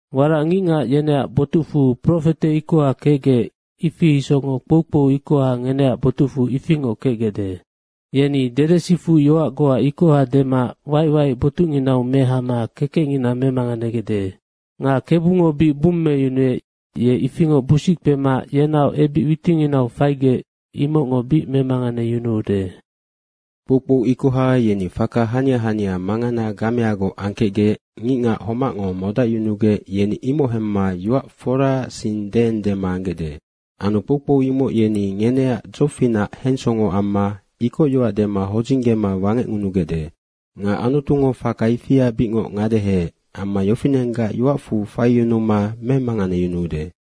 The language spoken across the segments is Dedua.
Warac ngicngac yeneac botucfu profete ikoha kecgec, ifi isocngoc kpoukpou ikoha ngeneac botucfu ifingoc kecgecde. Yeni dedesifuc yoac goa ikoha dema waic waic botucnginau mehama kekecngina memanganegecde. Nga Kebungo bic bummeyunuec, ye ifingoc busic kpema yenaoc ebic witinginau faigec, imocngo bic memanganeyunuude. Kpoukpou ikoha yeni faka hania hania mangana gameagoc angkecgec ngicngac homacngo modacyunugec yeni imoc hemma yoac foraac sing deendema anggecde. Anu kpoukpou imoc yeni ngeneac dzofinac hensongo amma ikocyoac dema hodzinggema wangecngunugecde. Nga Anutungo faka ifia bicngoc ngadeheec amma yofinenggac yoacfu faiyunuma memanganeyunuude.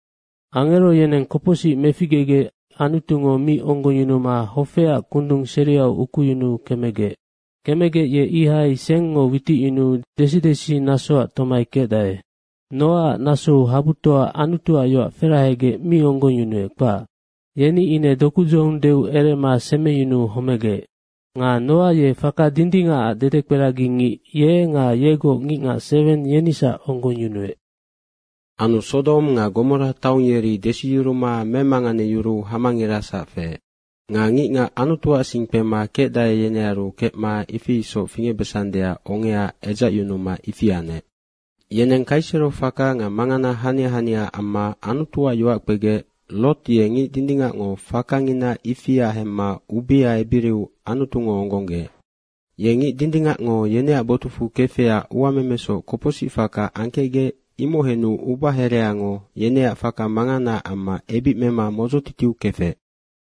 Angero yeneng kopocsic meficgegec Anutungo mi onggongyunuma hofeac kundung seriau ukuyunuu kemegec. Kemegec ye ihai sengngo witicyunuu desidesi nasoac tomai kecdae. Nga Noaac nasou habutoa Anutuac yoac ferahegec mi onggongyunuec, kpac. Yeni ine dokudzohong deu erema semeyunuu homegec. Nga Noa ye faka dindingacac dedekperagingic, ye nga yegoc ngicngac seweng, yenisac onggongyunuec. Anu Sodong nga Gomora taong, yeri desiyuruma memanganeyuruu hamangirasac feec. Nga ngicngac Anutuac sing kpema kecdae, yenearu kecma ifi isoc fingecbesandeac ongea edzacyunuma ifi anec. Yeneng kaisero faka nga mangana hania hania amma Anutuac yoac kpegec, Roti ye ngic dindingacngo fakangina ifia hemma ubea ebiriu Anutungo onggonggeec. Ye ngic dindingacngo yeneac botucfu kefecac uamemesoc kopocsic faka angkecgec, imoc henu ubahereango yeneac faka manganaac amma ebic mema modzotitiu kefec.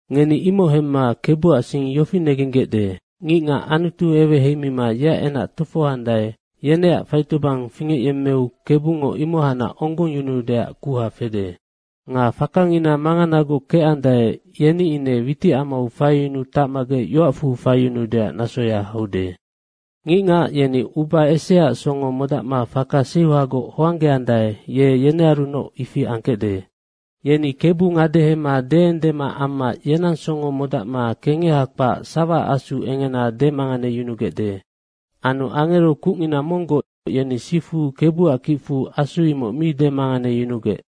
Ngeni imoc hemma Kebuac sing yofi negenggecde, ngicngac Anutu eweheimima yeac enac tofohoandae, yeneac faitobang fingecyemmeu Kebungo imohacnac onggongyunuudeac kuha fede. Nga fakangina manganagoc kecandae, yeni ine witicamau faiyunuu tacmagec yoacfu faiyunuudeac nasoya haude. Ngicngac yeni uba eseaac songo modacma faka seuhagoc hoanggeandae, ye yenearunoc ifi angkecde. Yeni Kebu ngadehema deendema amma yenang songo modacma kengeha kpac sawaac asu engena demanganeyunugecde. Anu angero kucngina monggoc yeni sifu Kebuac kicfu asu imoc mi demanganeyunugec.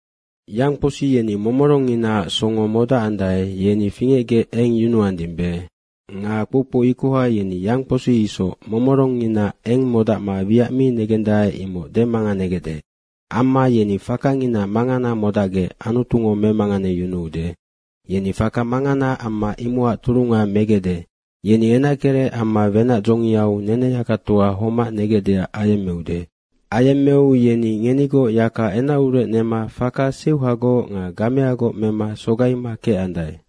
Yangkposi yeni momorongnginaac songo modacandae, yeni fingecgec eng yunuandimbe. Nga kpoukpou ikoha yeni yangkposi isoc momorongngina eng modacma wiac mi negendae, imoc demanganegecde. Amma yeni fakangina mangana modacgec Anutungo memanganeyunuude. Yeni faka mangana amma imocac turunga megecde. Yeni enackerec amma wenac dzongiau neneyakatoa homac negecdeac ayemmeude. Ayemmeu yeni ngenigoc yaka enacurec nema faka seuhagoc nga gameagoc mema sogaima kecandae.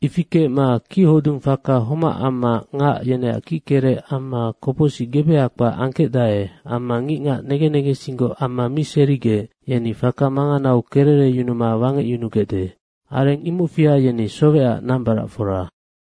Ifi kecma kichodung faka homac amma ngac yeneac kickerec amma kopocsic gebeha kpac angkecdae. Amma ngicngac negen negensinggoc amma mi serigec, yeni faka manganau kerereyunuma wangecyunugecde. Areng imocfia yeni sowecac nambaracfora.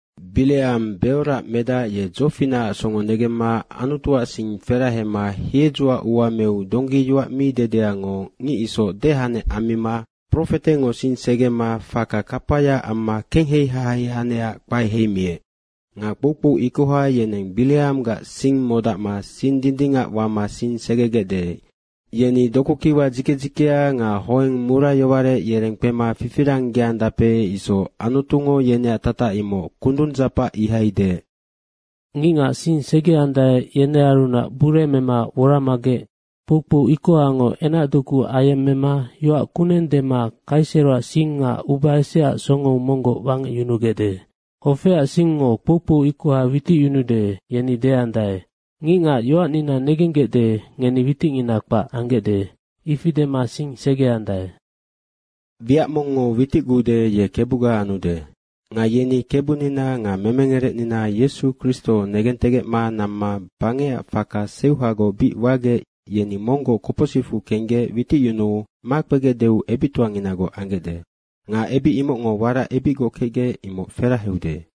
Bireang Beoroac medac, ye dzofinacac songo negemma Anutuac sing ferahema hiedzoac ua meu donggi yoac mi dedeango ngic isoc dehanec ammima profetengo sing segema faka kapaya amma kenghei hahei anecac kpae heimiec. Nga kpoukpou ikoha, yeneng Bireanggac sing modacma sing dindingac wama sing segegecde. Yeni dokukiwa dzike dzikea nga hoeng murayowarec yereng kpema fifiranggeandape isoc. Anutungo yeneac tatac imoc kundung dzapac ihai deec. Ngicngac sing segeandae, yenearunac bure mema woramagec kpoukpou ikohango enacdoku ayemmema yoac kuneng dema kaiseroac sing nga uba eseaac songou monggoc wangecyunugecde. Hofeac singngo kpoukpou ikoha witicyunude, yeni deandae, “Ngicngac yoacnina negenggecde, ngeni witicngina kpac anggecde.” ifi dema sing segeandae. Nocac wiac mongngo witicgude, ye kebuga anude. Nga yeni Kebunina nga memengerecnina Yesu Kristo negentegecma namma bangecac faka seuhagoc bic wagec, yeni monggoc kopocsicfu kenggec witicyunuu makpegecdeu ebictoanginagoc anggecde. Nga ebic imocngo warac ebicgoc kecgec, imoc feraheude.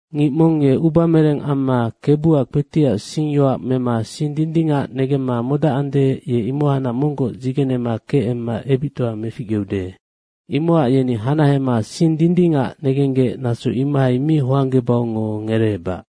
Ngic mong ye ubamereng amma Kebuac kpetiac singyoac mema sing dindingac negemma modacande, ye imohacnac monggoc dzigenema keema ebictoa meficgeude. Imocac yeni hanahema sing dindingac negenggec naso imohai mi hoanggebaungo ngereebac.